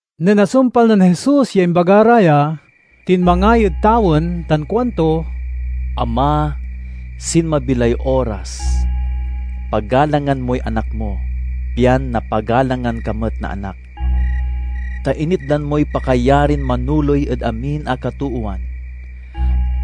Nen asumpal nen Jesus ya imbaga ra ya, tinmangay ed tawen tan kuanto, "Ama, sinmabi lay oras. Pagalangan moy Anak mo, pian napagalangan ka met na Anak. Ta initdan moy pakayarin manoley ed amin a katoowan,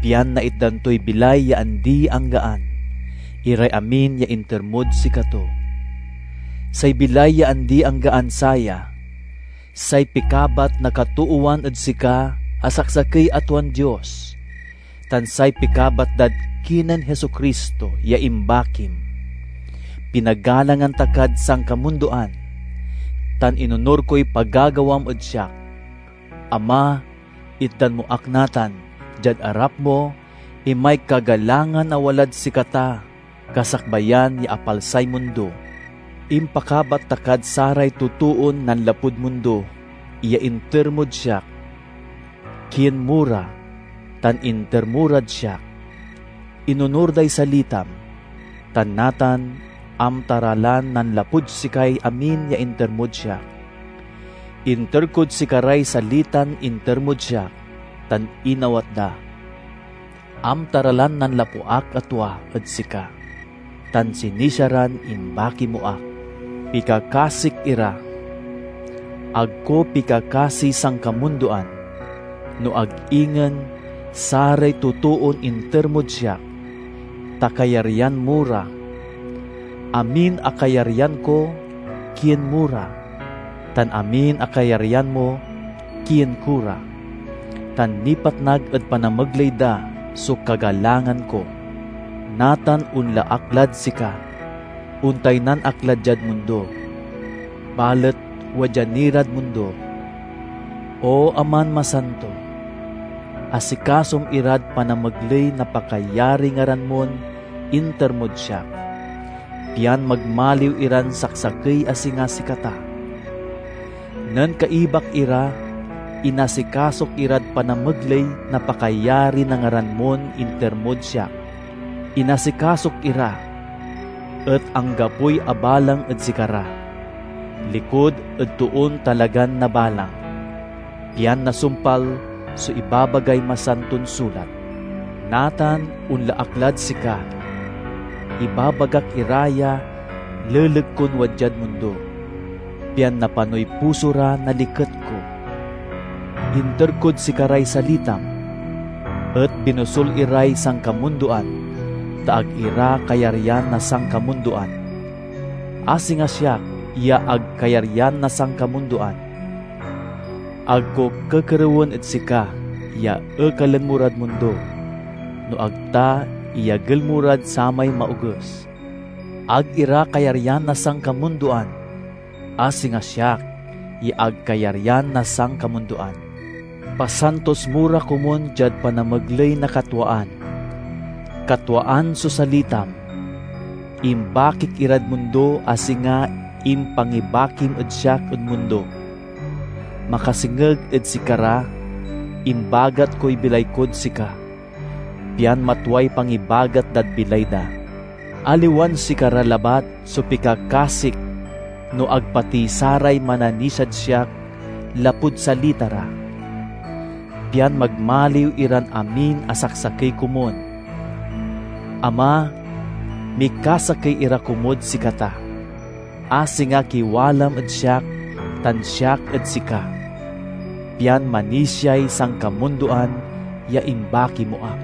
pian naitdan toy bilay ya andi-anggaan iray amin ya inter mod sikato. Say bilay ya andi-anggaan saya: say pikabat na katoowan ed sika a saksakey a tuan Dios, tan say pikabat dad kinen Jesu-Cristo ya imbakim. Pinagalangan ta kad sankamundoan, tan inonur koy pagagawam ed siak. Ama! Itdan mo ak natan, diad arap mo, imay kagalangan a walad sikata kasakbayan ya apalsay mundo. "Impakabat ta kad saray totoon nanlapud mundo ya inter mod siak. Kien mo ra, tan inter mo rad siak. Inonur day salitam, tan natan amta ra lan nanlapud sikay amin ya inter mod siak. Inter kod sikaray salitan inter mod siak tan inawat da. Amta ra lan nanlapu ak a tua ed sika, tan sinisia ran imbaki mo ak. "Pikakasik ira. Ag ko pikakasiy sankamundoan, no ag ingen saray totoon inter mod siak, ta kayaryan mo ra. Amin a kayaryan ko kien mo ra, tan amin a kayaryan mo kien ko ra; tan nipatnag ed panamegley da so kagalangan ko. Natan onla ak lad sika. Ontaynan ak la diad mundo, balet wadya ni rad mundo. O Aman Masanto! Asikasom irad panamegley na pakayariy ngaran mon inter mod siak, pian magmaliw iran saksakey a singa sikata. Nen kaibak ira inasikasok irad panamegley na pakayari na ngaran mon inter mod siak. Inasikasok ira, et anggapoy abalang ed sikara likud ed toon talagan nabalang, pian nasumpal so ibabagay Masanton Sulat. Natan onla ak lad sika; ibabagak ira ya leleg kon wadyad mundo, pian napanoy puso ra na liket ko. Inter kod sikaray salitam, et binosul iray sankamundoan ta ag ira kayaryan na sankamundoan, a singa siak ya ag kayaryan na sankamundoan. Ag ko kekerewen ed sika ya ekalen mo rad mundo, no ag ta iyagel mo rad samay Maoges. Ag ira kayaryan na sankamundoan, a singa siak ya ag kayaryan na sankamundoan. Pasantos mo ra komun diad panamegley na katwaan. Katwaan so salitam. Imbakik irad mundo a singa impangibakim ed siak ed mundo. Makasengeg ed sikara, imbagat koy bilay kod sika, pian matway pangibagat dad bilay da. "Aliwan sikara labat so pikakasik no ag pati saray mananisiad siak lapud salita ra, pian magmaliw iran amin a saksakey komun. Ama! Mikasakey ira komud sikata, a singa kiwalam ed siak tan siak ed sika, pian manisiay sankamundoan ya imbaki mo ak.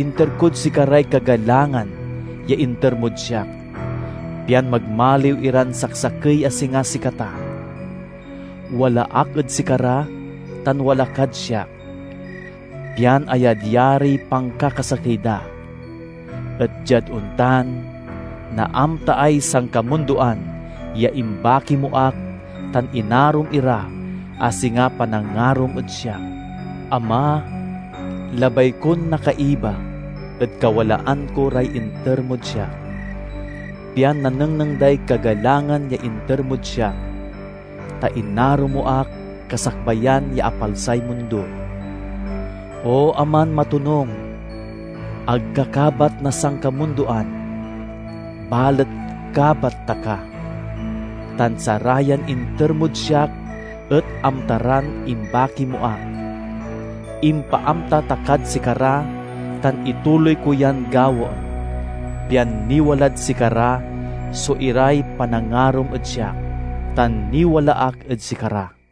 Inter kod sikaray kagalangan ya inter mod siak, pian magmaliw iran saksakey a singa sikata. Wala ak ed sikara tan wala kad siak, pian ayadyariy pankakasakey da. Et diad ontan, naamtaay sankamundoan ya imbaki mo ak tan inarom ira a singa panangarom ed siak. "Ama! Labay kon nakaiba ed kawalaan ko ray inter mod siak, pian nanengneng day kagalangan ya inter mod siak, ta inaro mo ak kasakbayan ya apalsay mundo. O Aman matonung! Ag ka kabat na sankamundoan, balet kabat ta ka, tan sarayan inter mod siak et amta ran imbaki mo ak. Impaamta ta kad sikara tan ituloy ko yan gawaen, pian niwalad sikara so iray panangarom ed siak, tan niwala ak ed sikara."